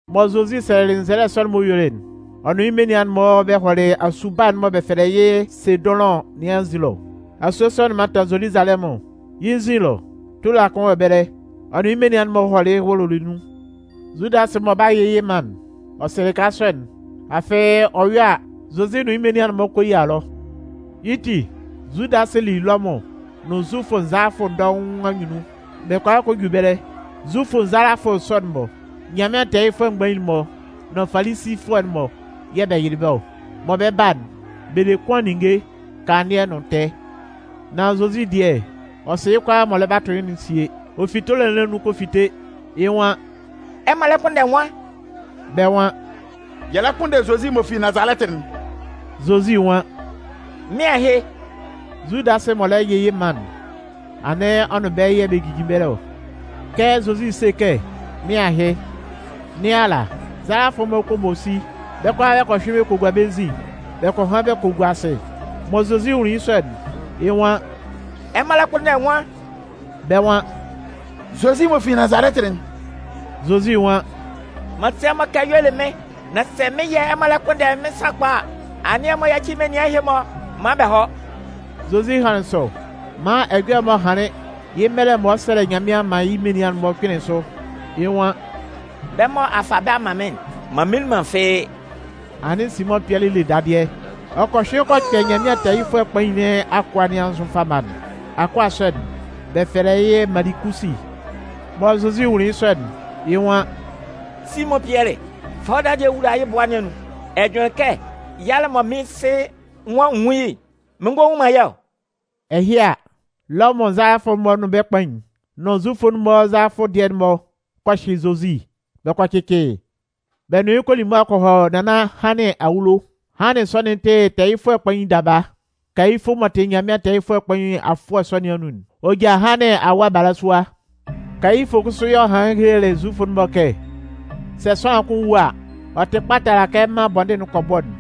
Mɔ Zozi sɛlɛlɩ nzɛlɛ sɔ'n m'ɔ yuelɩ'n, ɔ nʋn yɩ́ menian'n-mɔ bɛ hɔlɩ asue baa'n mɔ bɛ fɛlɛ yɩ́ Sedʋnlʋn nɩn anzin ɛlɔ. Asue sɔ'n mantan Zoluzalɛmʋn. Yɩ́ nzin ɛlɔ, tola kʋn wɔ ɛbɛlɛ, ɔ nʋn yɩ́ menian'n-mɔ hɔlɩ wʋlʋlɩ nun. Zudasɩ mɔ ɔ 'ba yɩ yɩ́ man'n, ɔ sɩ lɩka sɔ'n, afɩ ɔ yɔ a, Zozi nʋn yɩ́ menian'n-mɔ kɔ yia ɛlɔ. Yɩ́ ti, Zudasɩ li Lɔmʋn nʋn Zufʋ nzalafʋ dɔʋn anyunnun, bɛ kɔ a kɔ ju ɛbɛlɛ. Zufʋ nzalafʋ sɔ'n-mɔ, Nyanmɩan tɛɛyɩfʋɛ mgbain'n-mɔ nʋn Falisifʋɛ'n-mɔ yɛ̂ bɛ yɩlɩ bɛ́ ɔ. Mɔ bɛ 'ba'n, bɛ le kʋan ninnge, kanlannɩɛ nʋn tɛɛ. Nan Zozi dɩɛ, ɔ sɩ yɩ́ kʋalaa mɔ ɔ lɛ 'ba tʋ yɩ́'n sie. Ɔ fi tola nɩn anun kɔ fite, yɩ́ nwan: “Ɛmɔ lɛ kpʋnndɛ nwan?” Bɛ́ nwan: “Yɛ lɛ kpʋnndɛ Zozi m'ɔ fi Nazalɛtɩ'n.” Zozi nwan: “Mɩ́n ahɩ.” Zudasɩ m'ɔ lɛ yɩ yɩ́ man'n, anɩn ɔ nʋn bɛ́ yɛ̂ bɛ jijin ɛbɛlɛ ɔ. Kɛ Zozi 'se kɛ: “Mɩ́n ahɩ” nɩn ala, nzalafʋ'n-mɔ kɔ bɔ si, bɛ́ kʋalaa bɛ kɔ hyʋɩn bɛ kɔ hɔ bɛ́ nzin bɛ kɔ han bɛ kɔ gua asɩ. Mɔ Zozi nwunlin yɩ́ sɔ'n, yɩ́ nwan: “Ɛmɔ lɛ kpʋnndɛ nwan?” Bɛ́ nwan: “Zozi m'ɔ fi Nazalɛtɩ'n.” Zozi nwan: “M'an se ɛmɔ kɛ y'ɔ le mɩ́n. Nan sɛ mɩ́n yɛ̂ ɛmɔ lɛ kpʋnndɛ mɩ́n sakpa a, anɩn ɛmɔ yáci menian ɛhɩ-mɔ maan bɛ hɔ́.” Zozi hanlɩn sɔ maan ɛjɔlɛ'n m'ɔ hanlɩn yɩ́ mɛlɛ mɔ ɔ 'sɛlɛ Nyanmɩan man yɩ́ menian'n-mɔ'n kpɩnlɩn sʋ. Yɩ́ nwan: “Bɛ́ mɔ a fa bɛ́ a man mɩ́n'n, m'an mminlin man fɩ́ɩ́.” Anɩn Simʋn Pɩɛlɩ le dadɩɛ, ɔ kɔ hyʋɩn kɔ kpɛ Nyanmɩan tɛɛyɩfʋɛ kpain nɩn akʋa nɩn anzʋ fama'n. Akʋa sɔ'n, bɛ fɛlɛ yɩ́ Malikusi. Mɔ Zozi nwunlin yɩ́ sɔ'n, yɩ́ nwan: “Simʋn Pɩɛlɩ, fa wɔ́ dadɩɛ'n wula yɩ́ bʋa nɩn anun. Ɛ jʋnlɩn kɛ yalɛ'n mɔ mɩ́n Sɩ nwan n nwún yɩ́'n, mɩn ngɔ nwun man yɩ́ ɔ?” Ɛhɩ a, Lɔmʋn nzalafʋ'n-mɔ nʋn bɛ́ kpain'n, nʋn Zufʋ'n-mɔ nzalafʋ dɩɛ'n-mɔ kɔ hyɩ Zozi, bɛ kɔ cɩcɩ yɩ́. Bɛ nʋn yɩ́ kɔ li mʋa kɔ hɔ Nannan Hannɩn awulo. Hannɩn sɔ'n tɩ tɛɛyɩfʋɛ kpain daba. Kayifʋ m'ɔ tɩ Nyanmɩan tɛɛyɩfʋɛ kpain afʋɛ sɔ nɩn anun'n, ɔ ja Hannɩn awa balasua. Kayifʋ kʋsʋ yɛ̂ ɔ hanlɩn helelɩ Zufʋ'n-mɔ kɛ: “Sɛ sʋanlan kʋn wu a, ɔ tɩ kpa tala kɛ mân bɔndɩn'n kɔ bɔ'n.”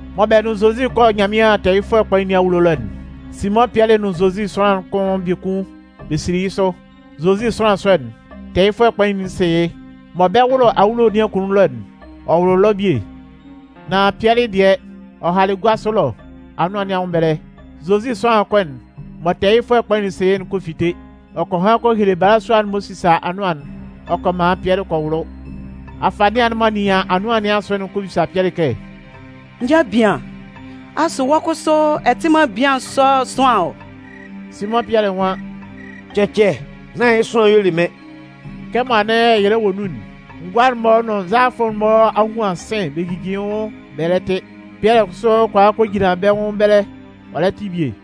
Mɔ bɛ nʋn Zozi 'kɔ Nyanmɩan tɛɛyɩfʋɛ kpain nɩn awulo ɛlɔ'n, Simʋn Pɩɛlɩ nʋn Zozi sʋanlan'n kʋn biekun bɛ sili yɩ́ sʋ. Zozi sʋanlan sɔ'n, tɛɛyɩfʋɛ kpain'n sɩ yɩ́. Mɔ bɛ 'wʋlʋ awulo nɩn akunnun ɛlɔ'n, ɔ wʋlʋlɩ ɛlɔ bie. Nan Pɩɛlɩ dɩɛ, ɔ halɩ gua sʋ ɛlɔ anʋan nɩn anwʋn ɛbɛlɛ. Zozi sʋanlan kʋn'n mɔ tɛɛyɩfʋɛ kpain'n sɩ yɩ́'n kɔ fite. Ɔ kɔ han kɔ hele balasua'n m'ɔ sisa anʋan'n ɔ kɔ man Pɩɛlɩ kɔ wʋlʋ. Afanɩan'n m'ɔ nɩan anʋan nɩn asʋ'n kɔ bisa Pɩɛlɩ kɛ: “N ja bian, asʋ wɔ́ kʋsʋ, ɛ tɩ man bian sɔ'n sʋanlan ɔ?” Simʋn Pɩɛlɩ nwan: “Cɛcɛ, nán yɩ́ sʋanlan y'ɔ le mɩ́n.” Kɛmɔ anɩn ɛyɛlɛ wɔ nun'n, ngʋa'n-mɔ nʋn nzalafʋ'n-mɔ a huan sɩ̂n bɛ jijin yɩ́ nwʋn bɛ lɛ tɩ. Pɩɛlɩ kʋsʋ kɔ a kɔ jinlan bɛ́ nwʋn ɛbɛlɛ ɔ lɛ tɩ bie.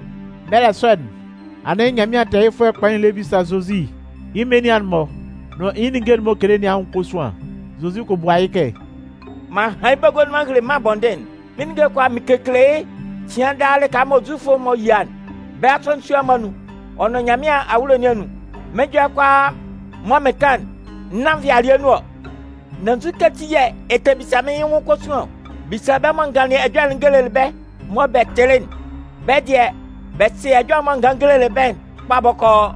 Mɛlɛ sɔ'n, anɩn Nyanmɩan tɛɛyɩfʋɛ kpain'n lɛ bisa Zozi yɩ́ menian'n-mɔ nʋn yɩ́ ninnge'n m'ɔ kekele nɩn anwʋn kosuan. Zozi kɔ bua yɩ́ kɛ: “M'an han yɩ́ bagua nun m'an hele mân'n bɔndɩn'n. Mɩ́n ninnge'n kʋalaa mɩn kekele yɩ́ cɩan daa lɩka mɔ Zufʋ'n-mɔ yia'n, bɛ́ asɔnɩn sua'n-mɔ anun ɔ nʋn Nyanmɩan awulo nɩn anun. Mɩ́n ɛjɔlɛ'n kʋalaa mɔ mɩn kan'n, nán nvɩalɩɛ nun ɔ. Nan nzukɛ ati yɛ̂ ɛ tɛ bisa mɩ́n yɩ́ nwʋn kosuan ɔ? Bisa bɛ́ mɔ n ganlɩn ɛjɔlɛ'n n gelelɩ bɛ́ mɔ bɛ tɩlɩ'n. Bɛ́ dɩɛ, bɛ sɩ ɛjɔlɛ'n mɔ n ganlɩn n gelelɩ bɛ́'n kpa bɔkɔɔ.”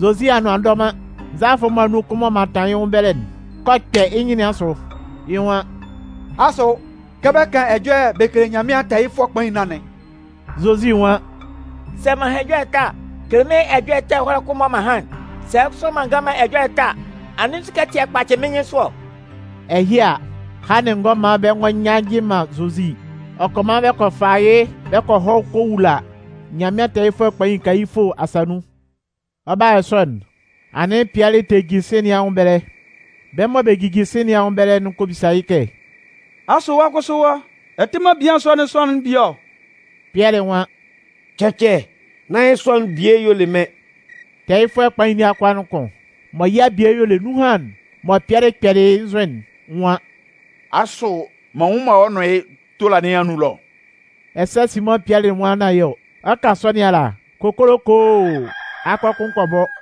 Zozi anʋan a ndɔ man, nzalafʋ'n-mɔ anun kʋn m'ɔ mantan yɩ́ nwʋn ɛbɛlɛ'n kɔ kpɛ yɩ́ nyɩn nɩn asʋ. Yɩ́ nwan: “Asʋ, kɛ bɛ kan ɛjɔlɛ bɛ kele Nyanmɩan tɛɛyɩfʋɛ kpain nɩn anɩn?” Zozi nwan: “Sɛ m'an han ɛjɔlɛ ɛtɛ a, kele mɩ́n ɛjɔlɛ ɛtɛ ɛhɔlɛ kʋn mɔ m'an han'n. Sɛ kʋsʋ m'an ngan man ɛjɔlɛ ɛtɛ a, anɩn nzukɛ ati yɛ̂ ɛ kpacɩ mɩ́n nyɩnsʋ ɔ?” Ɛhɩ a, Hannɩn ngɔ man bɛ ngɔ nyannjɩ man Zozi, ɔ kɔ man bɛ kɔ fa yɩ́ bɛ kɔ hɔ kɔ wula Nyanmɩan tɛɛyɩfʋɛ kpain Kayifʋ asa nun. Ɔ 'ba yɔ sɔ'n, anɩn Pɩɛlɩ tɛ jin sɩ̂n nɩn anwʋn ɛbɛlɛ. Bɛ́ mɔ bɛ jijin sɩ̂n nɩn anwʋn ɛbɛlɛ'n kɔ bisa yɩ́ kɛ: “Asʋ wɔ́ kʋsʋ wɔ́, ɛ tɩ man bian sɔ'n sʋanlan'n bie ɔ?” Pɩɛlɩ nwan: “Cɛcɛ, nán yɩ́ sʋanlan'n bie y'ɔ le mɩ́n.” Tɛɛyɩfʋɛ kpain nɩn akʋa'n kʋn mɔ yɩ́ abie y'ɔ le nunhan'n mɔ Pɩɛlɩ kpɛlɩ yɩ́ nzʋ'n nwan: “Asʋ m'an nnwun man wɔ́ nʋn yɩ́ tola nɩn anun ɛlɔ ɔ?” Ɛsɛ Simʋn Pɩɛlɩ nwan nán yɩ́ ɔ. Ɔ 'kan sɔ nɩn ala, kokolokoo! Akɔ kʋn kɔ bɔ.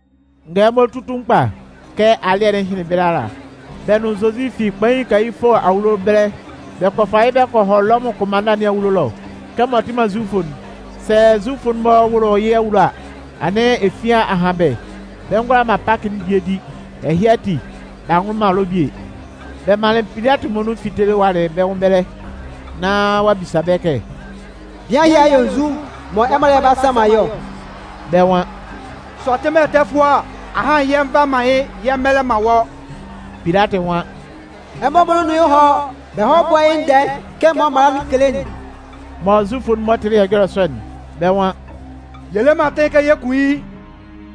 Ngɛlɛmɔ tutun kpa, kɛ alɩ́ɛ'n hɩnlɩn ɛbɛlɛ ala, bɛ́ nʋn Zozi fi kpain Kayifʋ awulo ɛbɛlɛ, bɛ kɔ fa yɩ́ kɔ hɔ Lɔmʋn kʋnmanna nɩn awulo ɛlɔ. Kɛmɔ ɔ tɩ man Zufʋ'n, sɛ Zufʋ'n-mɔ wʋlʋ yɩ́ awulo ɛlɔ a, anɩn efian a han bɛ́, bɛ ngʋala man Pakɩ'n bie di, ɛhɩ ati b'a nwʋlʋ man ɛlɔ bie. Bɛ manlɩn Pilatɩ muonun fitelɩ walɩ bɛ́ nwʋn ɛbɛlɛ, nán ɔ'a bisa bɛ́ kɛ: “Bian ɛhɩ a yɔ nzu mɔ ɛmɔ lɛ 'ba sanman yɩ́ ɔ?” Bɛ́ nwan: “Sɛ ɔ tɩ man ɛtɛfʋɛ a, ahan yɛ nva man yɩ́ yɛ mmɛlɛ man wɔ́.” Pilatɩ nwan: “Ɛmɔ muonun nʋn yɩ́ hɔ́, bɛ hɔ́ búa yɩ́ ndɛɛ kɛ ɛmɔ mala'n kele'n.” Mɔ Zufʋ'n-mɔ tɩlɩ ɛjɔlɛ sɔ'n, bɛ́ nwan: “Yɛ le man atɩn kɛ yɛ kun yɩ́.”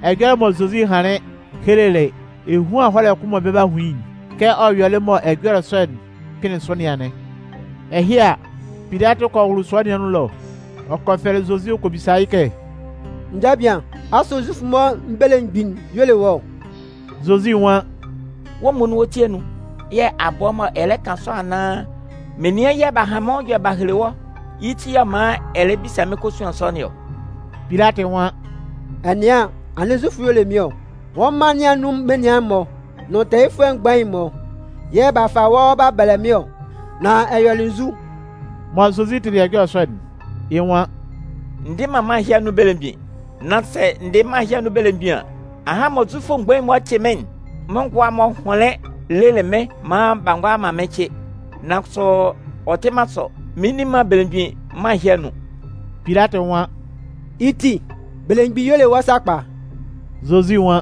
Ɛjɔlɛ mɔ Zozi hanlɩn helelɩ ehuan ɛhɔlɛ kʋn'n mɔ bɛ 'ba hun yɩ́'n, kɛ ɔ yɔlɩ mɔ ɛjɔlɛ sɔ'n kpɩnlɩn sʋ nɩn anɩn. Ɛhɩ a, Pilatɩ kɔ wʋlʋ sua nɩn anun ɛlɔ ɔ kɔ fɛlɛ Zozi ɔ kɔ bisa yɩ́ kɛ: “N ja bian, asʋ Zufʋ'n-mɔ belemgbin'n y'ɔ le wɔ́ ɔ?” Zozi nwan: “Wɔ́ muonun wɔ́ ti anun yɛ̂ a bɔ mɔ ɛ lɛ kan sɔ anaan, menian yɛ̂ b'a han mɩ́n nwʋn ɛjɔlɛ b'a hele wɔ́, yɩ́ ti yɛ̂ ɔ man ɛ lɛ bisa mɩ́n kosuan sɔ nɩn ɔ?” Pilatɩ nwan: “Ɛ nɩan an, anɩn Zufʋ y'ɔ le mɩ́n ɔ? Wɔ́ mân nɩn anun menian'n-mɔ nʋn tɛɛyɩfʋɛ mgbain'n-mɔ yɛ̂ b'a fa wɔ́ b'a bɛlɛ mɩ́n ɔ. Nan ɛ yɔlɩ nzu?” Mɔ Zozi tɩlɩ ɛjɔlɛ sɔ'n, yɩ́ nwan: “N dɩ man mân ɛhɩ anun belemgbin. Nan sɛ n dɩ mân ɛhɩ anun belemgbin an, ahan mɔ Zufʋ mgbain'n-mɔ 'cɩ mɩ́n'n, mɩ́n ngʋa'n-mɔ hʋnlɩn lelɩ mɩ́n maan b'a ngʋala man mɩ́n cɩ. Nan kʋsʋ ɔ tɩ man sɔ, mɩn nni man belemgbin mân ɛhɩ anun.” Pilatɩ nwan: “Yɩ́ ti, belemgbin y'ɔ le wɔ́ sakpa?” Zozi nwan: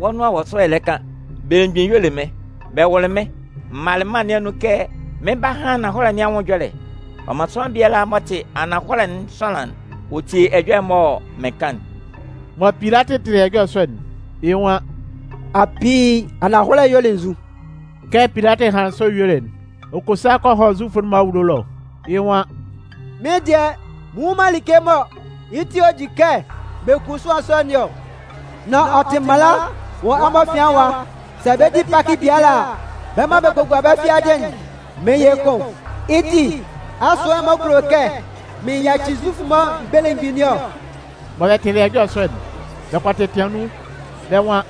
“Wɔ́ nʋan wɔ sʋ ɛ lɛ kan, belemgbin y'ɔ le mɩ́n. Bɛ wʋlɩ mɩ́n, m malɩ mân nɩn anun kɛ mɩn 'ba han ananhɔlɛ nɩn anwʋn ɛjɔlɛ. Ɔ man sʋanlan biala m'ɔ tɩ ananhɔlɛ'n sʋanlan'n, ɔ tie ɛjɔlɛ'n mɔ mɩn kan'n.” Mɔ Pilatɩ tɩlɩ ɛjɔlɛ sɔ'n, yɩ́ nwan: “Apii, ananhɔlɛ'n y'ɔ le nzu?” Kɛ Pilatɩ hanlɩn sɔ yuelɩ'n, ɔ kɔ sa kɔ hɔ Zufʋ'n-mɔ anwʋn ɛlɔ, yɩ́ nwan: “Mɩ́n dɩɛ, mɩn nnwun man like mɔ yɩ́ ti yɛ̂ ɔ di kɛ bɛ kun sʋanlan sɔ nɩn ɔ. Nan ɔ tɩ mala wɔ ɛmɔ afian ɛwa, sɛ bɛ 'di Pakɩ biala a, bɛ́ mɔ bɛ kɔ gua bɛ́ fiadɩ'n, mɩn yɩ kʋn. Yɩ́ ti, asʋ ɛmɔ kulo kɛ mɩn yaci Zufʋ'n-mɔ belemgbin nɩn ɔ?” Mɔ bɛ tɩlɩ ɛjɔlɛ sɔ'n, bɛ kɔ tɛtɩan nun, bɛ́ nwan: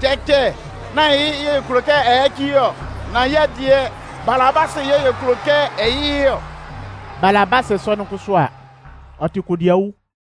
“Cɛcɛ, nán yɩ́ yɛ̂ yɛ kulo kɛ ɛ yaci yɩ́ ɔ! Nan yɛ́ dɩɛ, Balabasɩ yɛ̂ yɛ kulo kɛ ɛ yɩ yɩ́ ɔ!” Balabasɩ sɔ'n kʋsʋ a, ɔ tɩ kodiawu.